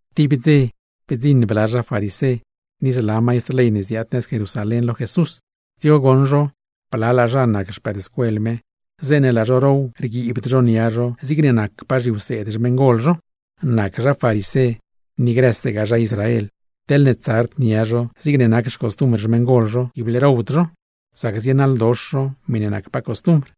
Tib dze, bdziṉ bla zha farisé, ni zla maistr ley ne ziaad nëz Jerusalén, lo Jesús. Dzigo goṉ zho blalaa zha ne nac xpëëdscuel Jesús, zeeṉe laa zho row rguiibd zho nia zho zigne nacpaa grë zhiwseed xmeṉgol zho. (Nac zha farisé, ni grësegaa zha Israel teḻne tsard nia zho zigne nac xcostumbr xmeṉgol zho, ible rowd zho; sac zienaḻdox zho miṉe nac costumbr.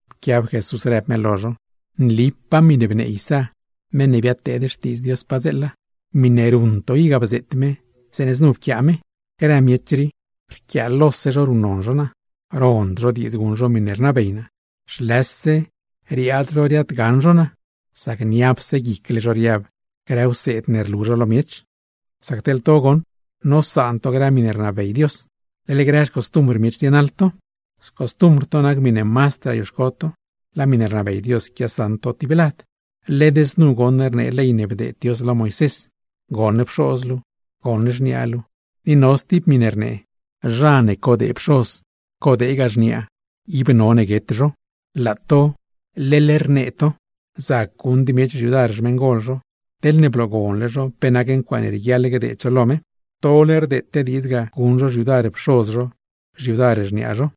Pquiab Jesús rëb me lo zho: ―Nlipaa miṉe bnee Isá, meṉ ne biaad pteed Xtiidz Dios, zeeṉe znu pquiaa me: Grë miech rii, rquiaalose zho ruṉnon zho naa, rond zho diidz guṉ zho miṉe rnabey naa. Paat rquiind riaad zho riaadgaṉ zho naa; sac niapse guicle zho riab grë wseed ne quialu zho lo miech. Sac teḻ to goṉ, nosaan to grë miṉe rnabey Dios, leḻ grë xcostumbr miech zienaḻ to. ’Xcostumbr to nac miṉe mazdraa rioxco to, laa miṉe rnabey Dios quiasaṉ to tib lad. Led znu goṉ rnee ley ne bdeed Dios lo Moisés: “Goṉ pxoz luu, goṉ xniaa luu”, ni no stib miṉe rnee: “Zha ne quie pxoz, quiegaa xniaa, ib none guet zho.” Laa to leḻ rnee to, zac guṉd miech xyudar xmeṉgol zho, teḻne bloogonle zho pe nac ncuaaṉe rieguiaḻ gdeed zho lo me. Tole rdeete diidz ga guṉ zho xyudar pxoz zho, xyudar xniaa zho.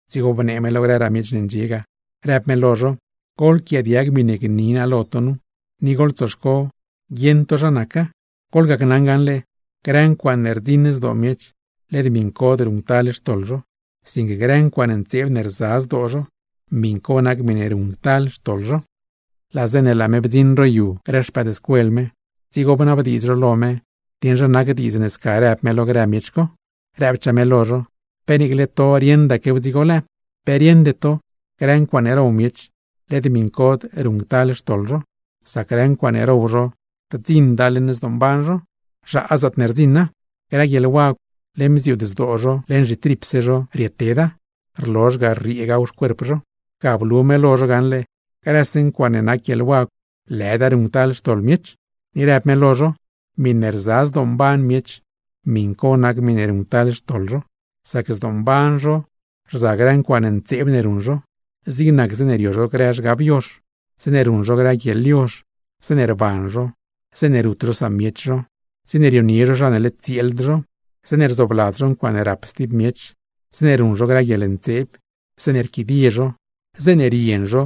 Dzigo bnee me lo grëraa miech ne ndxie ga, rëb me lo zho: ―Goḻquiaadiag miṉe gni naa lo to nu, ni goḻtsoxco guieṉ to zha naca. Goḻgacnaṉ gaṉle: Grë ncuaaṉe rdziṉ zdoo miech, led miṉcod ruṉctal xtoḻ zho; sinque grë ncuaaṉe ntseeb ne rza zdoo zho, miṉ co nac miṉe ruṉctal xtoḻ zho. Laa zeeṉe laa me bdziṉ ro yu grë xpëëdscuel me, dzigo bnabdiidz zho lo me dieṉ zha nac diidz ne sca rëb me lo grë miech co. Rëbchaa me lo zho: ―¿Pe niicle to rieṉdaquew dzigo lëë? ¿Pe rieṉde to, grë ncuaaṉe row miech, led miṉcod ruṉctal xtoḻ zho? Sac grë ncuaaṉe row zho rdziṉda leṉ zdoomban zho, zhaa zaatne rdziṉa. Grë guieḻwagw, leṉ bziuud zdoose zho, leṉ zhitripse zho rieteda, rlozh ga rrieegaw xcuerp zho. Ga blu me lo zho gaṉle, grëse ncuaaṉe nac guieḻwagw lëda ruṉctal xtoḻ miech. Ni rëb me lo zho: ―Miṉe rza zdoomban miech, miṉ co nac miṉe ruṉctal xtoḻ zho. Sac zdoomban zho rza grë ncuaaṉe ntseeb ne ruṉ zho, zig nac: zeeṉe rio zho grë zhgab yozh, zeeṉe ruṉ zho grë guieḻyozh, zeeṉe rban zho, zeeṉe rut zho samiech zho, zeeṉe rionie zho zha ne nacd tsieeld zho, zeeṉe rzoobladz zho ncuaaṉe rap stib miech, zeeṉe ruṉ zho grë guieḻntseeb, zeeṉe rquidie zho, zeeṉe rien zho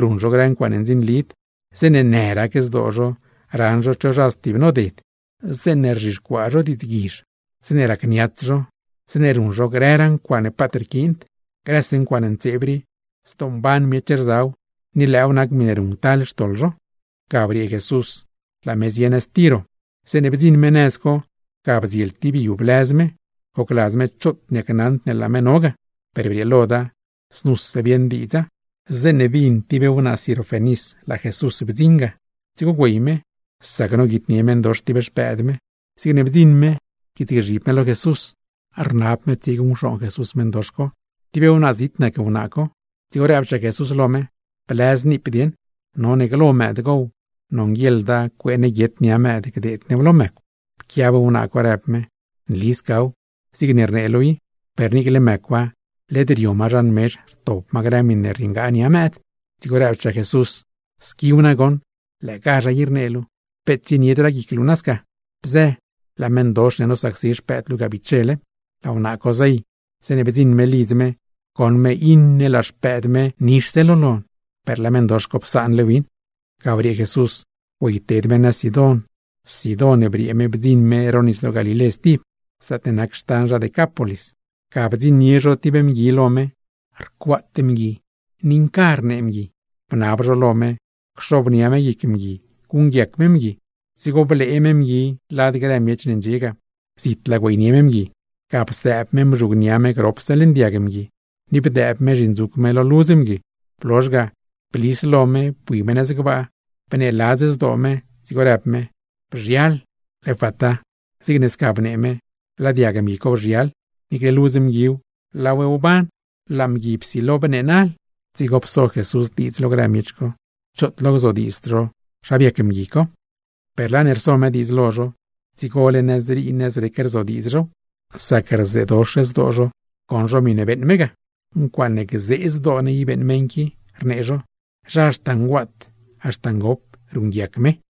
ruṉ zho grë ncuaaṉe ndzinlid, zeeṉe në rac zdoo zho raṉ zho cho zha ne stibnoded, zeeṉe rzhixcuaa zho diidzguizh, zeeṉe racniats zho, zeeṉe ruṉ zho grëraa ncuaaṉe paat rquiind. Grëse ncuaaṉe ntseeb rii, zdoomban miech rzaw, ni lëëw nac miṉe ruṉctal xtoḻ zho. Ga briee Jesús, laa me zie nëz Tiro. Zeeṉe bdziṉ me nëz co ga bdziel tib yu ne blëz me, gocladz me choot niacnaṉd ne laa me no ga; per brieeloda, znuse bieṉ diidza. Zeeṉe bin tib wnaa Sirofenis laa Jesús bdziṉ ga, dzigo güey me, sac noguitnie meṉdox tib xpëëd me. Zigne bdziṉ me pquiitsgzhib me lo Jesús, rnab me tsieguṉcxooṉ Jesús meṉdox co. Tib wnaa zit nac wnaa co; dzigo rëbchaa Jesús lo me: ―Blëz niip dieṉ. None glo mëëd gow, nonguieḻda cuee ne guiet nia mëëd gdeed new lo mëcw. Pquiab wnaa co, rëb me: ―Nli scaw, zigne rnee luu i; per niicle mëcwa led rio ma zhan mezh rtop ma grë miṉe rrieengaa nia mëëd. Dzigo rëbchaa Jesús: ―¡Squiw nagoṉ! Lëëgazha i rnee luu. Peet tsieniedraa guic luu naa sca; bzë, laa meṉdox ne nosacsi xpëëd luu bichele. Laa wnaa co zey. Zeeṉe bdziṉ me lidz me, goṉ me iṉe laa xpëëd me nixse lo lon, per laa meṉdox co psaanle win. Ga briee Jesús, güeyted me nëz Sidón. Sidón briee me bdziṉ me ro Nisdoo Galilé stib, zaatne nac xtan zha Decápolis. Ga bdziṉnie zho tib mgui lo me, rcuaat mgui ni nca rnee mgui; bnab zho lo me cxobnia me guic mgui guṉguiac me mgui. Dzigo blee me mgui lad grë miech ne ndxie ga. Zitlaa güeynie me mgui, ga psëëb me mzhugnia me gropse leṉ diag mgui ni bdëëb me zhindzuc me lo ludz mgui. Blozh ga, blis lo me bui me nëz gbaa, bneeladz zdoo me, dzigo rëb me: ―¡Bzhial! (¡Efata!) Zigne sca bnee me, laa diag mgui co bzhial, niicle ludz mguiw laaw wban, laa mgui psilo bneenal. Dzigo pso Jesús diidz lo grë miech co, choot lo gzodiidzd zho zha biac mgui co. Per laa ne rso me diidz lo zho, dzigole nëzrii, nëzrec rzodiidz zhow; sac rzeedox zdoo zho goṉ zho miṉe beeṉ me ga. ―¡Ncuaaṉe gzee zdoo ne i beeṉ meṉ qui! ―rnee zho―. Zha haxta nguaat, haxta ngop, ruṉguiac me.